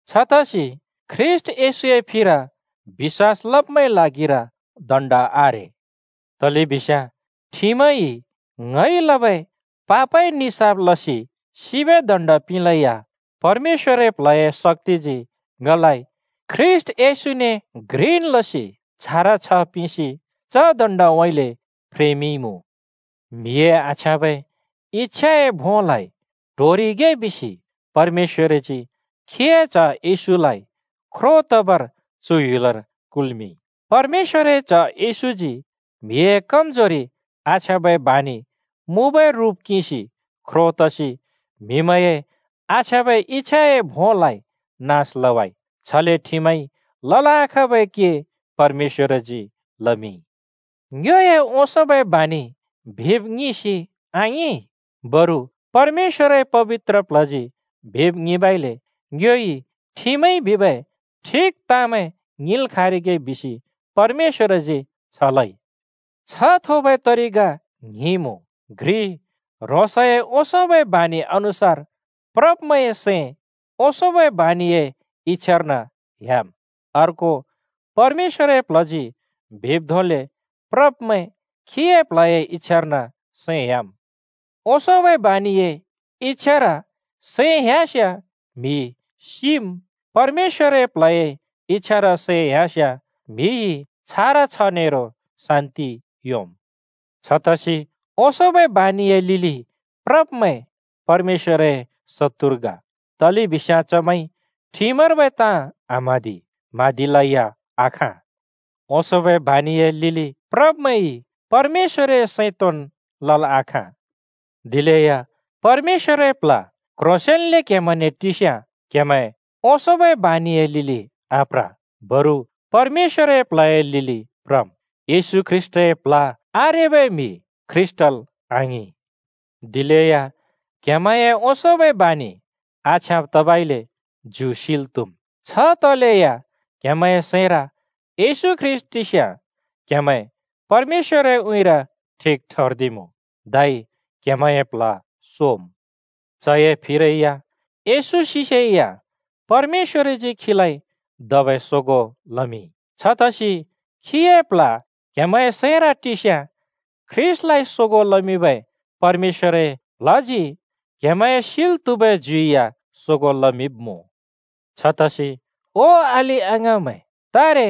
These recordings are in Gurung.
छतसि ख्रीष्‍ट येशूए फिर बिश्‍वास लब्‍मैंए ल्हागिर दण्ड आरे। तलेबिस्याँ ठिमइ ङइ लबै पापए निसाफ लसि सिबै दण्ड पिंलेया परमेश्‍वरए प्ल्हए शक्‍तिजी ङलाइ ख्रीष्‍ट येशूने घ्रिन् लसि छारा छ्ह पिंसि च दण्डउँइँले फ्रेमिंइमुँ। म्‍हिए आछ्याँबै इच्‍छाए भोंलाइ ट्होरिगे बिसि परमेश्‍वरजी खीए च्ह येशूलाइ ख्रो तबर चु ह्‍युलर कुल्‍मिंइ। परमेश्‍वरए च्‍ह येशूजी म्‍हिए कमजोरि आछ्याँबै बानि मुँबै रुप किंसि ख्रो तसि म्हिमैंए आछ्याँबै इच्‍छाए भोंलाइ नास लवाइ। छले ठिमइ लल् आखाँबै के परमेश्‍वरजी लमिंइ। ङ्योए ओंसोंबै बानिइ बिब् ङिंसि आङिं, बरु परमेश्‍वरए पबित्र प्ल्हजी बिब् ङिंबइले ङ्योइ ठिमइ बिबै ठिक ताँमैं ङिंल् खाँरिगे बिसि परमेश्‍वरजी छ लइ। छ्ह थोबै तरिका ङ्हिं मुँ: घ्रि, ह्रोंसए ओंसोंबै बानि अनुसार प्रब्मैंए सैं ओंसोंबै बानिए इच्‍छार्न ह्‍याम्। अर्को, परमेश्‍वरए प्ल्हजी बिब् धोंले प्रब्मैं खीए प्ल्हए इच्‍छार्न सैं ह्‍याम्। ओंसोंबै बानिए इच्‍छार सैं ह्‍यास्याँ म्‍हि सिम्, परमेश्‍वरए प्ल्हए इच्‍छार सैं ह्‍यास्याँ म्‍हिइ छारा छ्ह नेरो शान्‍ति योंम्। छतसि ओंसोंबै बानिए लिलि प्रब्मैं परमेश्‍वरए शत्तुर ग, तलेबिस्याँ चमैंइ ठिमर्बै ताँ आम्हाँदि, म्हाँदिलै या आखाँ। ओंसोंबै बानिए लिलि प्रब्‍मैंइ परमेश्‍वरए सैं तोंन् लल् आखाँ। दिलेया परमेश्‍वरए प्ल्ह क्‍ह्रोंसेंन्‍ले क्‍हेमैंने टिस्याँ क्‍हेमैं ओंसोंबै बानिए लिलि आप्र, बरु परमेश्‍वरए प्ल्हए लिलि प्रम्। येशू ख्रीष्‍टए प्ल्ह आरेबै म्‍हि ख्रीष्‍टल् आङिं। दिलेया क्‍हेमैंए ओंसोंबै बानि आछ्याँब तबइले ज्यु सिल् त्हुम्। छ तलेया क्‍हेमैंए सैंर येशू ख्रीष्‍ट टिस्याँ क्‍हेमैं परमेश्‍वरए उँइँर ठिक ठर्दिमुँ, धै क्‍हेमैंए प्ल्ह सोम्। चए फिरै या येशू सिसेया परमेश्‍वरजी खीलाइ धबै सोगों लमिंइ। छतसि खीए प्ल्ह क्‍हेमैंए सैंर टिस्याँ ख्रीष्‍टलाइ सोगों लमिंबै परमेश्‍वरए प्ल्हजी क्‍हेमैंए सिल् त्‍हुबै ज्यु या सोगों लमिंब्मुँ। छतसि ओ अलि-अङाँमैं, तारे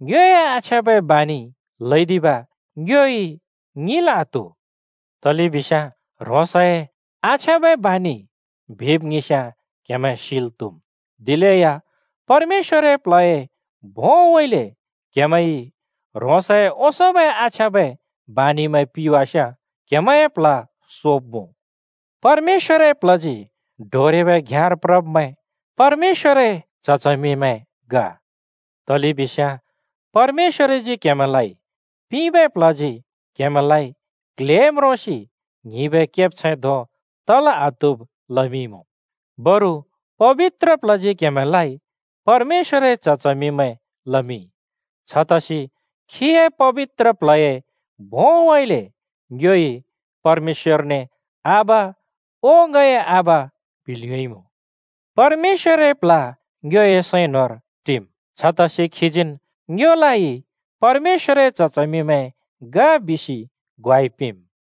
ङ्योए आछ्याँबै बानिइ ल्हैदिब ङ्योइ ङिंल् आत्‍हु। तलेबिस्याँ ह्रोंसए आछ्याँबै बानिइ बिब् ङिंस्‍याँ क्‍हेमैं सिल् त्‍हुम्। दिलेया परमेश्‍वरए प्ल्हए भोंउँइँले क्‍हेमैंइ ह्रोंसए ओंसोंबै आछ्याँबै बानिमैं पिवास्‍याँ क्‍हेमैंए प्ल्ह सोब्‍मुँ। परमेश्‍वरए प्ल्हजी डोरेबै घ्‍याँर प्रब्मैं परमेश्‍वरए च्‍ह-च्हमिमैं ग। तलेबिस्याँ परमेश्‍वरजी क्‍हेमैंलाइ पिंबै प्ल्हजी क्‍हेमैंलाइ क्ल्हे म्रोंसि ङ्हिंबै केब्छैं धों तल् आत्हुब् लमिंइमुँ, बरु पबित्र प्ल्हजी क्‍हेमैंलाइ परमेश्‍वरए च्‍ह-च्हमिमैं लमिंइ, छतसि खीए पबित्र प्ल्हए भोंउँइँले ङ्योइ परमेश्‍वरने “आबा, ओ ङए आबा,” बिल् योंइमुँ। परमेश्‍वरए प्ल्ह ङ्योए सैं न्‍होंर टिम्, छतसि खीजीन् ङ्योलाइ परमेश्‍वरए च्‍ह-च्हमिमैं ग बिसि ग्वाइ पिंम्।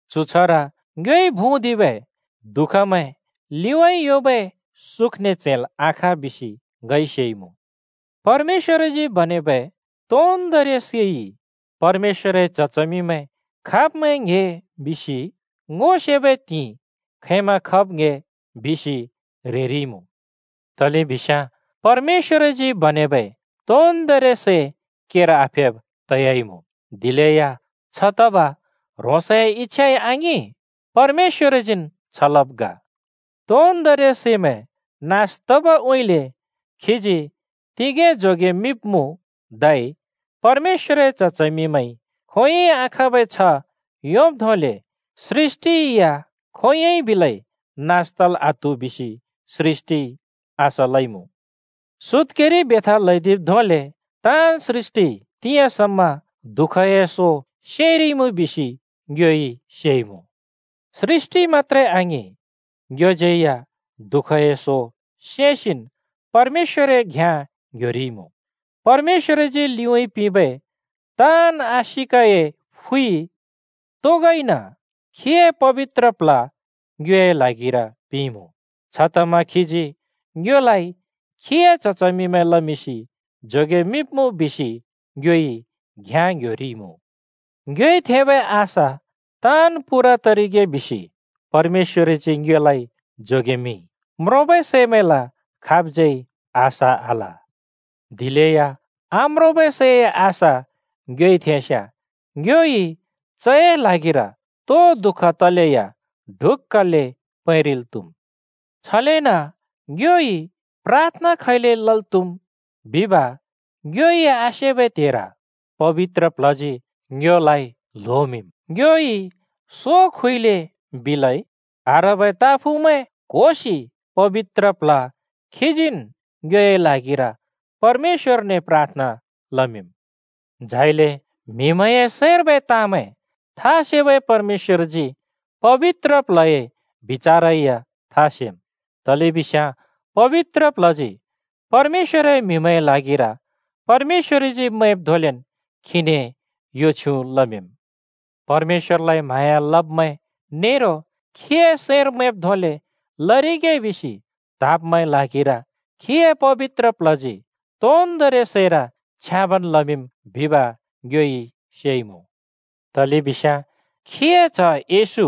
चु छ्हर ङ्योइ भुँदिबै दुःखमैं लिउँइँ योंबै सुखने च्हैंल् आखाँ बिसि ङइ सेइमुँ। परमेश्‍वरजी बनेबै तोन्दोंरि सैइ परमेश्‍वरए च्‍ह-च्हमिमैं खाब्मैं ङ्‍हे बिसि ङो सेबै त्हिंइ खैंमा ङ्‍हे बिसि ह्रेरिइमुँ। तलेबिस्याँ परमेश्‍वरजी बनेबै तोन्दोंरि सै केर आफेब् तयाइमुँ, दिलेया छ तब ह्रोंसए इच्‍छाइ आङिं, परमेश्‍वरजीन् छ लवाब् ग। तोन्दोंरि सैमैं नास तबउँइँले खीजी तिगें जोगेमिंब्मुँ, धै परमेश्‍वरए च्‍ह-च्हमिमैंइ खोंयोंइ आखाँबै छ्ह योंब् धोंले सृष्‍टि या खोंयोंन् बिलै नास तल् आत्हु बिसि सृष्‍टिइ आशा लइमुँ। सुत्‍केरि बेथा ल्‍हैदिब् धोंले ताँन् सृष्‍टिइ तिंयाँ समा दुःखए सो सेंरिइमुँ बिसि ङ्योइ सेइमुँ। सृष्‍टि मत्‍त्रे आङिं, ङ्योज्‍यै या दुःखए सो सेंसिन् परमेश्‍वरए घ्‍याँ ङ्‌ह्‍योरिइमुँ। परमेश्‍वरजी लिउँइँ पिंबै ताँन् आशिकए फुइ तोगोइन खीए पबित्र प्ल्ह ङ्योए ल्हागिर पिंइमुँ। छतमा खीजी ङ्योलाइ खीए च्‍ह-च्हमिमैं लमिंसि जोगेमिंब्मुँ बिसि ङ्योइ घ्‍याँ ङ्‌ह्‍योरिइमुँ। ङ्योइ थेंबै आशा ताँन् पूरा तरिगे बिसि परमेश्‍वरजी ङ्योलाइ जोगेमिंइ। (म्रोंबै सैमैंल खाबज्‍यै आशा आल। दिलेया आम्रोंबै सैए आशा ङ्योइ थेंस्‍याँ ङ्योइ चए ल्हागिर तो दुःख तलेया ढुक्‍कले पैंरिल् त्‍हुम्।) छलेन ङ्योइ प्राथना खैले लल् त्हुम बिब ङ्योइ आसेबै त्हेर पबित्र प्ल्हजी ङ्योलाइ ल्होमिंम्। ङ्योइ सो खुइले बिलै आह्रबै ताँफुँमैं क्होसि पबित्र प्ल्ह खीजीन् ङ्योए ल्हागिर परमेश्‍वरने प्राथना लमिंम्। झाइले म्‍हिमैंए सैंर्बै ताँमैं था सेबै परमेश्‍वरजी पबित्र प्ल्हए बिचारै या था सेम्, तलेबिस्याँ पबित्र प्ल्हजी परमेश्‍वरए म्‍हिमैंए ल्हागिर परमेश्‍वरजी मैंब् धोंले खीने यो छ्युँ लमिंम्। परमेश्‍वरलाइ म्हाँया लब्मैं नेरो खीए सैंर मैंब् धोंले लरिगे बिसि त्हाँब्मैंए ल्हागिर खीए पबित्र प्ल्हजी तोन्दोंरि सैर छ्याँबन् लमिंम् बिब ङ्योइ सेइमुँ। तलेबिस्याँ खीए च्‍ह येशू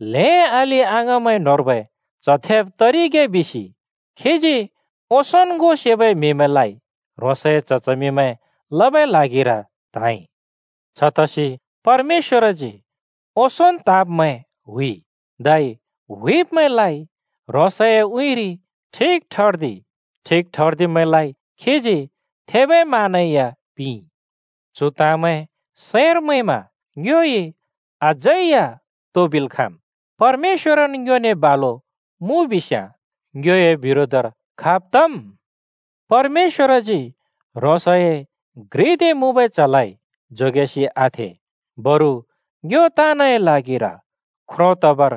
ल्हें अलि-अङाँमैं न्‍होंर्बै च्ह थेब तरिगे बिसि खीजी ओंसोंन् ङो सेबै म्‍हिमैंलाइ ह्रोंसए च्‍ह-च्हमिमैं लबै ल्हागिर त्हाँइ। छतसि परमेश्‍वरजी ओंसोंन् त्हाँब्‍मैं हुइइ, धै हुइब्‍मैंलाइ ह्रोंसए उँइँरि ठिक ठर्दिइ, ठिक ठर्दिब्‍मैंलाइ खीजी थेबै मान या पिंइमुँ। चु ताँमैं सैंर मैंमा ङ्योइ अझै या तो बिल् खाँम्? परमेश्‍वरन् ङ्योने बालुन् मुँ बिस्याँ, ङ्योए बिरोधर खाब् तम्? परमेश्‍वरजी ह्रोंसए घ्रिदे मुँबै च्‍हलाइ जोगेसि आथें, बरु ङ्यो ताँनए ल्हागिर ख्रो तबर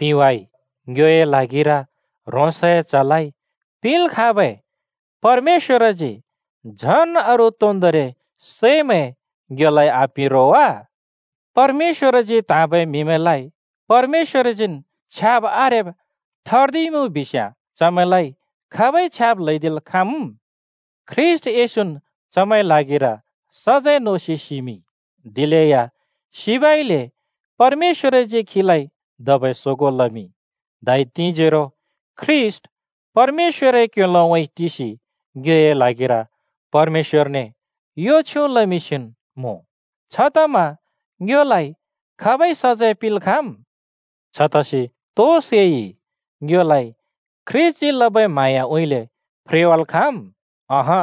पिंवाइ। ङ्योए ल्हागिर ह्रोंसए च्‍हलाइ पिंल् खाँबै परमेश्‍वरजी झन् अरू तोन्दोंरि सैमैं ङ्योलाइ आपिं रो वा? ह्रोंसजी त्‍हाँबै म्‍हिमैंलाइ परमेश्‍वरजीन् छ्याब् आरेब् ठर्दिमिंइमुँ बिस्याँ चमैंलाइ खाबइ छ्याब् ल्‍हैदिल् खाँम्? ख्रीष्‍ट येशून् चमैंए ल्हागिर सजैं नोसि सिमिंइ, दिलेया सिबइले परमेश्‍वरजी खीलाइ धबै सोगों लमिंइ। धै तिंजोरो ख्रीष्‍ट परमेश्‍वरए क्‍योलोउँइँ टिसि ङ्योए ल्हागिर परमेश्‍वरने यो छ्युँ लमिंसिन् मुँ। छतमा ङ्योलाइ खाबइ सजैं पिंल् खाँम्? छतसि तो सैइ ङ्योलाइ ख्रीष्‍टजी लबै म्हाँयाउँइँले फ्रेवाल् खाँम्? अँहँ,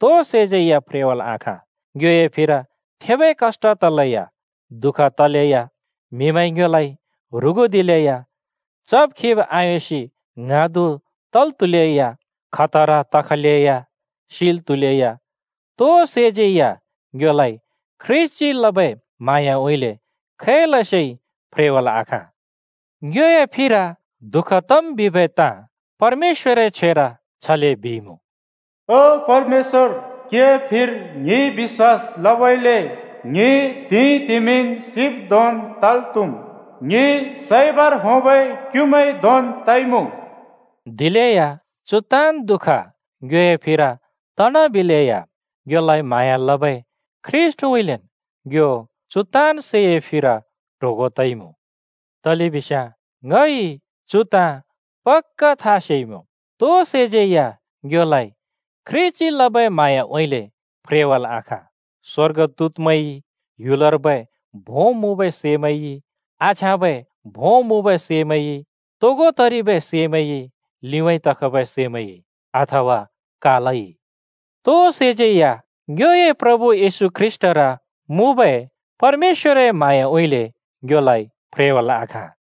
तो सैज्‍यै या फ्रेवाल् आखाँ! ङ्योए फिर थेबै कष्‍ट तलेया, दुःख तलेया, म्हिमैंइ ङ्योलाइ ह्रुगुदिलेया, चब-खिब आयोंसि ङ्हाँदु तल् त्‍हुलेया, खतरा तखलेया, सिल् त्‍हुलेया, तो सैज्‍यै या ङ्योलाइ ख्रीष्‍टजी लबै म्हाँयाउँइँले खैलसे फ्रेवाल् आखाँ। (ङ्योए फिर दुःख तम् बिबै ताँ परमेश्‍वरए छ्वेर छले बिइमुँ: “ओ परमेश्‍वर, क्‍हिए फिर ङिइ बिश्‍वास लबइले ङि त्‍हिंइतिमिन् सिब् धोंन् तल् त्हुम्, ङि सैबर होंबै क्युमैं धोंन् तइमुँ।” दिलेया चु ताँन्दुःख ङ्योए फिर तनाबिलेया ङ्योलाइ म्हाँया लबै ख्रीष्‍टउँइँलेन् ङ्यो चु ताँन् सैए फिर ट्होगों तइमुँ। तलेबिस्याँ ङइ चु ताँ पक्‍का था सेइमुँ: तो सैज्‍यै या ङ्योलाइ ख्रीष्‍टजी लबै म्हाँयाउँइँले फ्रेवाल् आखाँ। स्‍वर्गदूतमैंइ, ह्‍युलर्बै भों मुँबै सैमैंइ, आछ्याँबै भों मुँबै सैमैंइ, तोगो तरिबै सैमैंइ, लिउँइँ तखबै सैमैंइ, अथवा कालइ, तो सैज्‍यै या ङ्योए प्रभु येशू ख्रीष्‍टर मुँबै परमेश्‍वरए म्हाँयाउँइँले ङ्योलाइ फ्रेवाल् आखाँ।